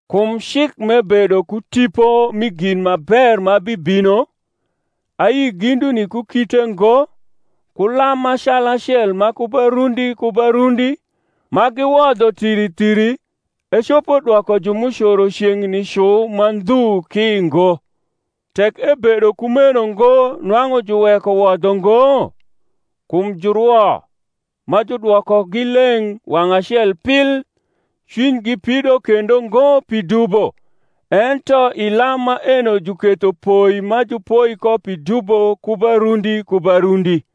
Kum cik m’ebedo ku tipo mi gin ma ber ma bibino, ayi ginduni ku kite ngo, ku lam ma calacel ma ku ba rundi ku ba rundi, ma giwodho thiri thiri, ecopo dwoko ju m’ucoro ceng’ni cu ma ndhu ki ngo. Tek ebedo kumeno ngo nwang’u juweko wodho ngo? kum jurwo, ma judwokogi leng’ wang’ acel pil, cwinygi pido kendo ngo pi dubo. Ento i lam maeno juketho poi ma jupoi ko pi dubo ku ba rundi ku ba rundi.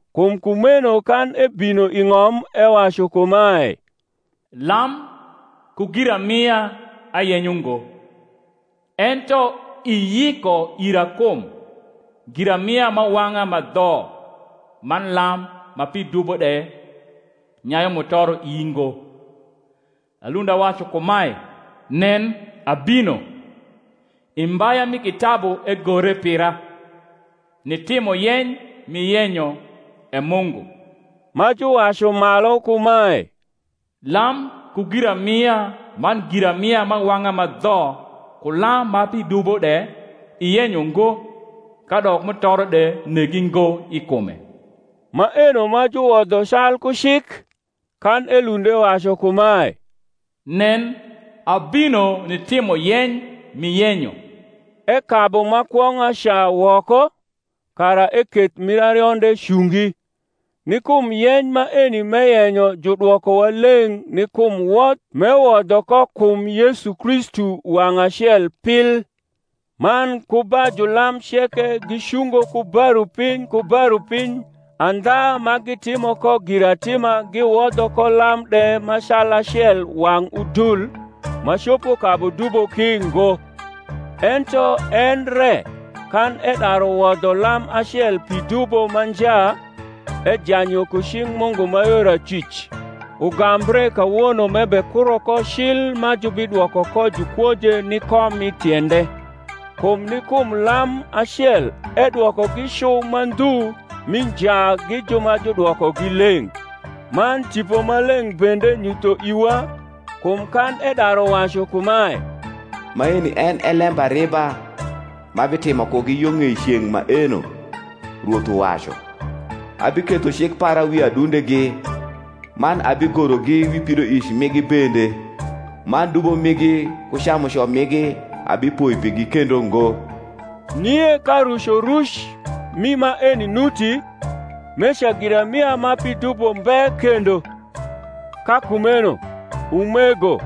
Kum kumeno kan ebino i ng’om, ewacu kumae, Lam ku giramia ayenyo ngo, Ento iyiko ira kum; Giramia m’awang’a ma dho man lam ma pi dubo de nyayu mutoro ii ngo: Alund awacu kumae, Nen, abino (I mbaya mi kitabu egore pira) Nitimo yeny m’iyenyo, E Mungu. Ma juwacu malu kumae, Lam ku giramia man giramia m’awang’a ma dho ku lam ma pi dubo de iyenyo ngo, kadok mutoro de negi ngo i kume (maeno ma juwodho calku cik), kan elund ewacu kumae, Nen, abino nitimo yeny m’iyenyo. Ekabu ma kwong’a ca woko, kara eketh mir arionde cungi. Ni kum yeny maeni m’eyenyo judwokowa leng’ ni kum wodh m’ewodho ko kum Yesu Kristu wang’ acel pil. Man ku ba jniam ceke gicungo ku ba rupiny ku ba rupiny andha ma gitimo ko giratima giwodho ko lam de ma calacel wang’ udul, ma copo kabu dubo ki ngo: ento en re, kan edaru wodho lam acel pi dubo ma nja, ejany yo ku cing’ Mungu ma yor acwic; ugambre kawono m’ebekuro ko cil ma jubidwoko ko jukwoje ni kom mi tiende. Kum ni kum lam acel edwokogi cu ma ndhu mi nja gi ju ma judwokogi leng’. Man Tipo Maleng’ bende nyutho iwa; kum kan edaru wacu kumae, Maeni en e lembariba m’abitimo kugi Yo ng’ei ceng’ maeno, Rwoth uwacu: Abiketho cik para wi adundegi, Man abigorogi wi pidoic migi bende; Man dubo migi ku camuco migi abipoi pigi kendo ngo. Nie ka rucoruc rni maeni nuti, meca giramia ma pi dubo mbe kendo. Ka kumeno, umego,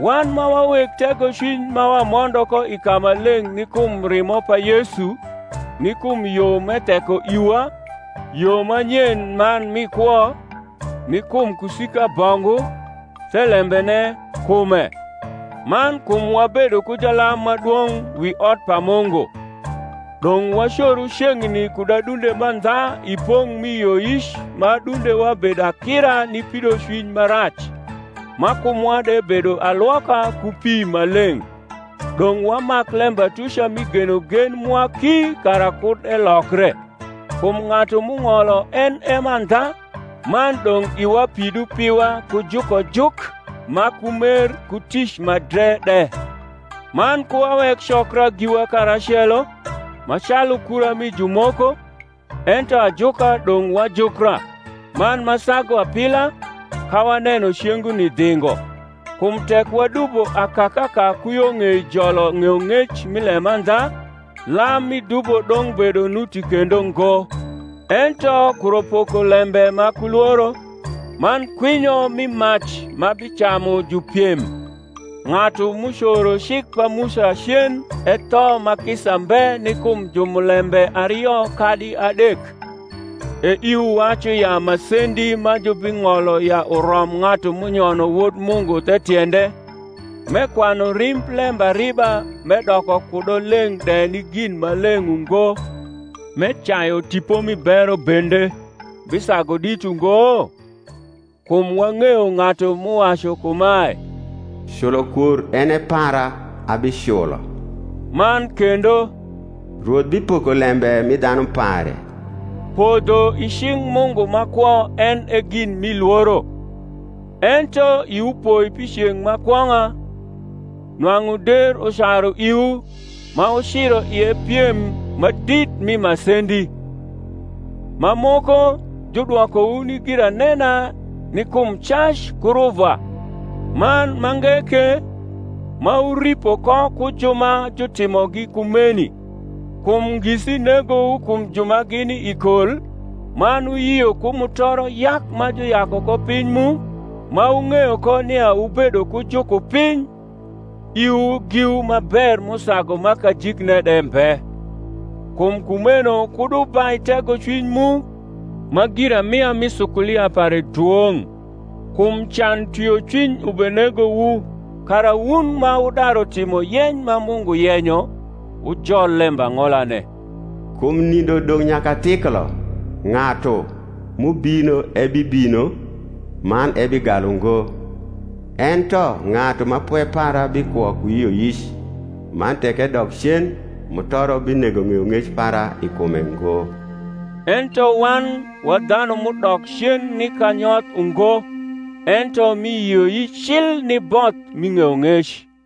wan ma wa weg tegocwiny ma wamondo ko i kamaleng’ ni kum rimo pa Yesu, ni kum yo m’etheko iwa, yo ma nyen man mi kwo, ni kum kusika bongu, thelembene, kume; man kum wabedo ku jalam ma dwong’ wiotpaMungu; dong’ wacoru ceng’ni kud adunde mandha i pong’ mi yioyic ma adundewa bedo akira ni pidocwiny ma rac: ma kumwa de bedo alwoka ku pi ma leng’, dong’ wamak lembatuca mi genogen mwa ki kara kud elokre; kum ng’atu m’ung’olo en e mandha: man dong’ iwa pidu piwa ku jukojuk ma ku mer ku tic ma dre de; man ku wawek cokra giwa karacelo, ma calu kura mi jumoko, ento ajuka dong’ wajukra; man ma sagu apila, ka waneno cenguni dhingo. Kum tek wadubo akakaka ku yo ng’ei jolo ng’eyong’ec mi lemandha, lam mi dubo dong’ bedo nuti kendo ngo, ento kuro pokolembe ma ku lworo, man kwinyo mi mac ma bicamu jupiem. Ng’atu m’ucoro cik pa Musa cen etho ma kisa mbe ni kum jumulembe ario kadi adek: e iwu wacu ya masendi ma jubing’olo ya urom ng’atu m’unyono Wod Mungu the tiende, m’ekwanu rimb lembariba m’edoko kudo leng’ de ni gin ma leng’ ungo, m’ecayu Tipo mi bero bende, bisagu dit ungo? Kum wang’eyo ng’atu m’uwacu kumae, Culokwor en e para, abiculo. Man kendo, Rwoth bipoko lembe mi dhanu pare, Podho i cing’ Mungu ma kwo en e gin mi lworo. Ento iwu poi pi ceng’ ma kwong’a, nwang’u der ucaru iwu, ma wuciro ie piem ma dit mi masendi; ma moko, judwokowu ni giranena ni kum cac ku ruvwa; man mange ke, ma wuripo ko ku ju ma jutimogi kumeni. Kum ngisi negowu kum ju ma gini i kol, man wuyio ku mutoro yak ma juyaku ko piny mu, ma wung’eyo ko nia wubedo ku jukupiny iwu giwu ma ber m’usagu ma kajikne de mbe. Kum kumeno kud wubai tegocwiny mu, ma giramia mi sukulia pare dwong’. Kum can twiocwiny ubenegowu, kara, wun ma wudaru timo yeny ma Mungu yenyo, wujol lembang’olane. Kum nindo dong’ nyakathiklo, Ng’atu m’ubino ebibino, man ebigalu ngo. Ento ng’atu ma pwe para bikwo ku yioyic: Man tek edok cen, mutoro binego ng’eyong’ec para i kume ngo. Ento wan wa dhanu m’udok cen ni kanyoth ungo; ento mi yioyic cil ni both mi ng’eyong’ec.